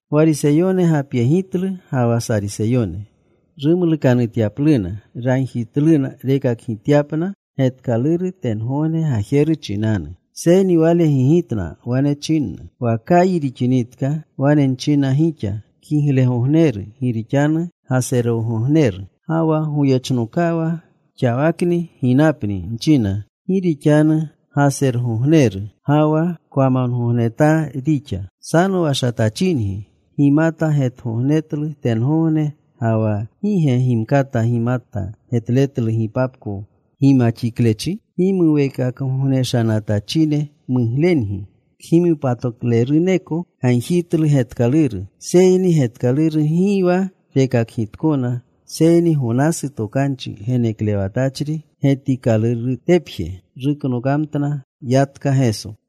Gwariseyone gapyegitlu ga wa Sariseyone rumlukanutyapluna. Ragjitluna rekakgityapna getkaluru tengogne gajeru chinanu. Seyni Wale gigitna. Wane chinna, “Wa kayi rixinitka, wane nchina gixa, ‘Kiglegogneru gi rixanu gasergogneru.’ Ga wa goyechnokawa, ‘Xawakni ginapni,’ nchina, ‘gi rixanu gasergogneru ga wa kwamongognetaa rixa.’ Sanowashatachingi. Gimata getgogneretlu tengogne ga wa ¿gi ge gimkata gimata getletlu gipapko gimaxiklechi? Gimuweekakgognenatachine muglengi, kgimopatakleruneko gagjitlu getkaluru, seyni getkaluru gi wa rekakgitkona seyni Gonasu tokanchi geneklewatchri getikalurutepje.” Ruknokamtna. Yatka Geso.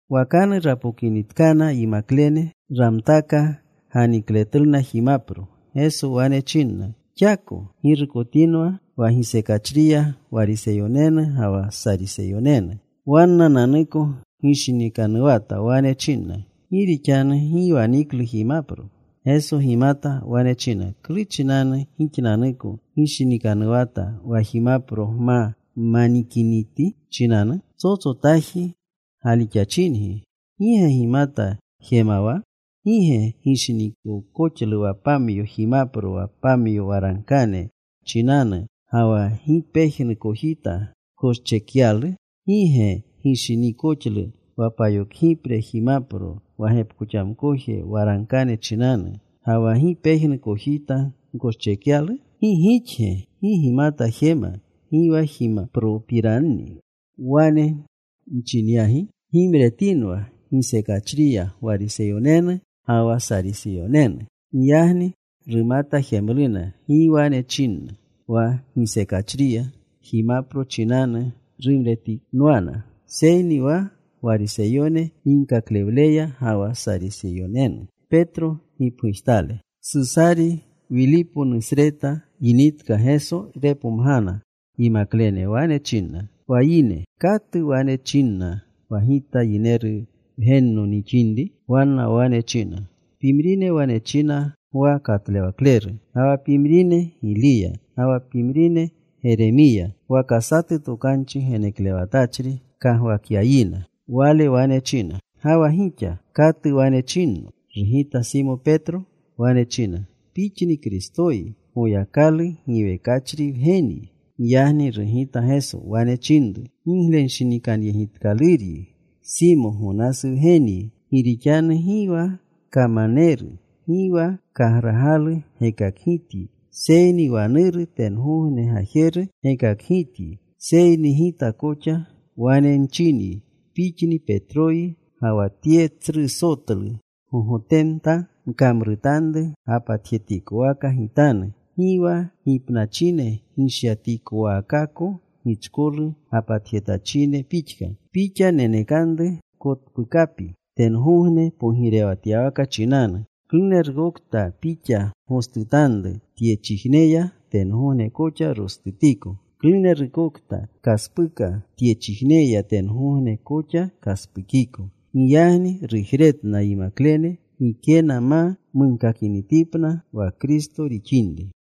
Wakanu rapokinitkana yimaklene. Ramtaka ganikletluna jimapro. Geso wane chinna, “Xako ggirukotinwa wa gisekachriya Gwariseyonenu ga wa Sariseyonenu.” Wannananuko gishinikanuwata. Wane chinna, “Gi rixanu gi waniklu jimapro.” Geso gimata. Wane china, “¿Klu chinanu gixnanuko gishinikanuwata wa jimapro gma manikiniti chinanu? Psotsotaaji galixachingi. ¿Gi ge gimata jemawa? ¿Gi ge gishiniikoxlu wa pamyo jimapro wa pamyo waragkane chinanu, ga wa gi pejnu kojita gkoschekyalu? ¿Gi ge gishiniikoxlu wa payokgipre jimpro wa gepkoxamkoje waragkane chinanu, ga wa gi pejnu kojita gkoschekyalu? ¿Gi gixge gi gimata jema gi wa jimapropiranni wane nchinyagi? Gimretinwa gisekachriya Gwariseyonenu ga wa Sariseyonenu.” Giyagni rumata jemluna gi wane chinna wa gisekachriya jimapro chinanu rumretinwana, seyni wa Gwariseyone ginkaklewleya ga wa Sariseyonenu. Susari Wiliponusreta yinitka, Geso gepomgana yimaklene. Wane chinna, “Wa yine ¿katu wane chinna wa Gita Yineru Wgenno nixinri?” Wanna wane china, “Pimrine wane china, ‘Gwa Katlewakleru.’ Ga wa pimrine, ‘Giliya.’ Ga wa pimrine, ‘Geremiya.’ Waka satu tokanchi geneklewatachri kagwakyayina.” Wale wane china, “Ga wa gixa, ¿katu wane chinno?” Rugita Simo Petro. Wane china, “Pixni Kristoyi. Goyakalu giwekachri Wgenyi.” Giyagni rugita Geso. Wane chinru, “Giglenshinikanyegitkaluryi Simo, Gonasu wgenyi, gi rixanu gi wa kamaneru, gi wa kagragalu gekakgityi, seyni wa Nuru tengogne Gajeru gekakgityi. Seyni Gita koxa wane nchinyi, pixni Petroyi, ga wa tye tsru sotlu gogotemta nkamrutanru gapatjetikowaka Gitanu. Gi wa gipnachine gishyatikowaakaako gichkolu gapatjetachine pixka. Pixa nenekanru kotpukapi tengogne pogirewatyawaka chinanu. Klunerukokta pixa gostutanru tyechijneya, tengogne koxa rostutiko. Klunerukokta pkaspuka tyechijneya, tengogne koxa kaspukiko.” Giyagni rujretna yimaklene gikena ma munkakinitipna wa Kristo rixinri.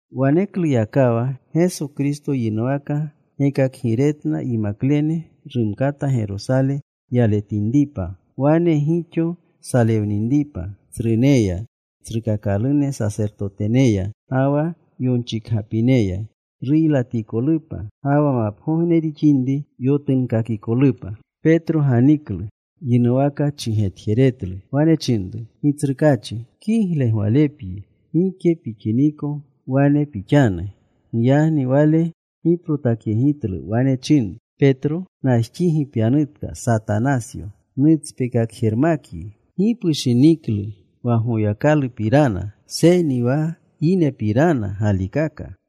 Wanekluyakawa Geso Kristo yinuwaka gekakgiretna yimaklene, rumkata Gerosale yaletinripa. Wane gixo salewninripa tsruneya, tsrukakalune sasertoteneya, ga wa yonchikgapineya; ruylatikolupa ga wa mapgogne rixinri yotunkakikolupa. Petro ganiklu. Yinuwaka chigetjeretlu. Wane chinru, “Gitsrukaachi, kigle gwalepyi. Gike pixiniko wane pixanu.” Giyagni Wale giprotakyegitlu. Wane chinru Petro, “Najxigi pyanutka, Satanasyo. Nutspekakjermakyi. Gi pushiniklu wa Goyakalupirana, seyni wa yinepirana galikaka.”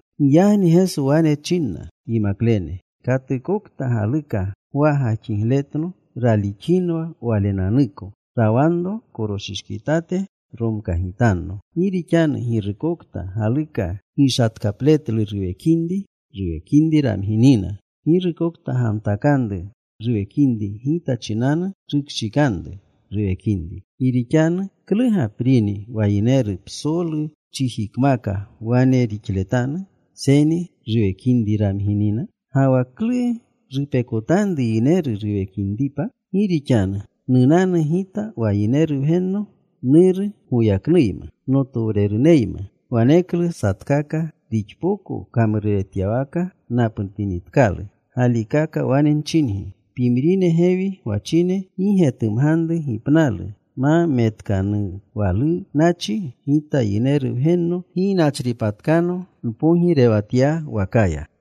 Giyagni Geso wane chinna yimaklene, “Katukokta galuka gwa gajxigletno raalixinwa walenanuko. Rawanro koroshishkitate. Romkagitanno. Gi rixanu girukokta galuka gishatkapletlu ruwekinri, ruwekinri ramginina. Girukokta gamtakanru ruwekinri Gita chinanu, rukshikanru ruwekinri. Gi rixanu ¿klu gaprini wa yineru psolu chijikmaka wane rixletanu, seyni ruwekinri ramginina? Ga wa ¿klu rupekotanru yineru ruwekinripa? Gi rixanu nunanu Gita wa Yineru Wgenno Nuru goyaknuyma, notowreruneyma. Waneklu satkaka rixpoko kamruretyawaka napnutinitkalu. Galikaka wane nchingi, pimrine gewi gwachine gi getumganru gipnalu ma metkanuwalunachi Gita Yineru Wgenno ginachripatkano npogirewatyawakaya.”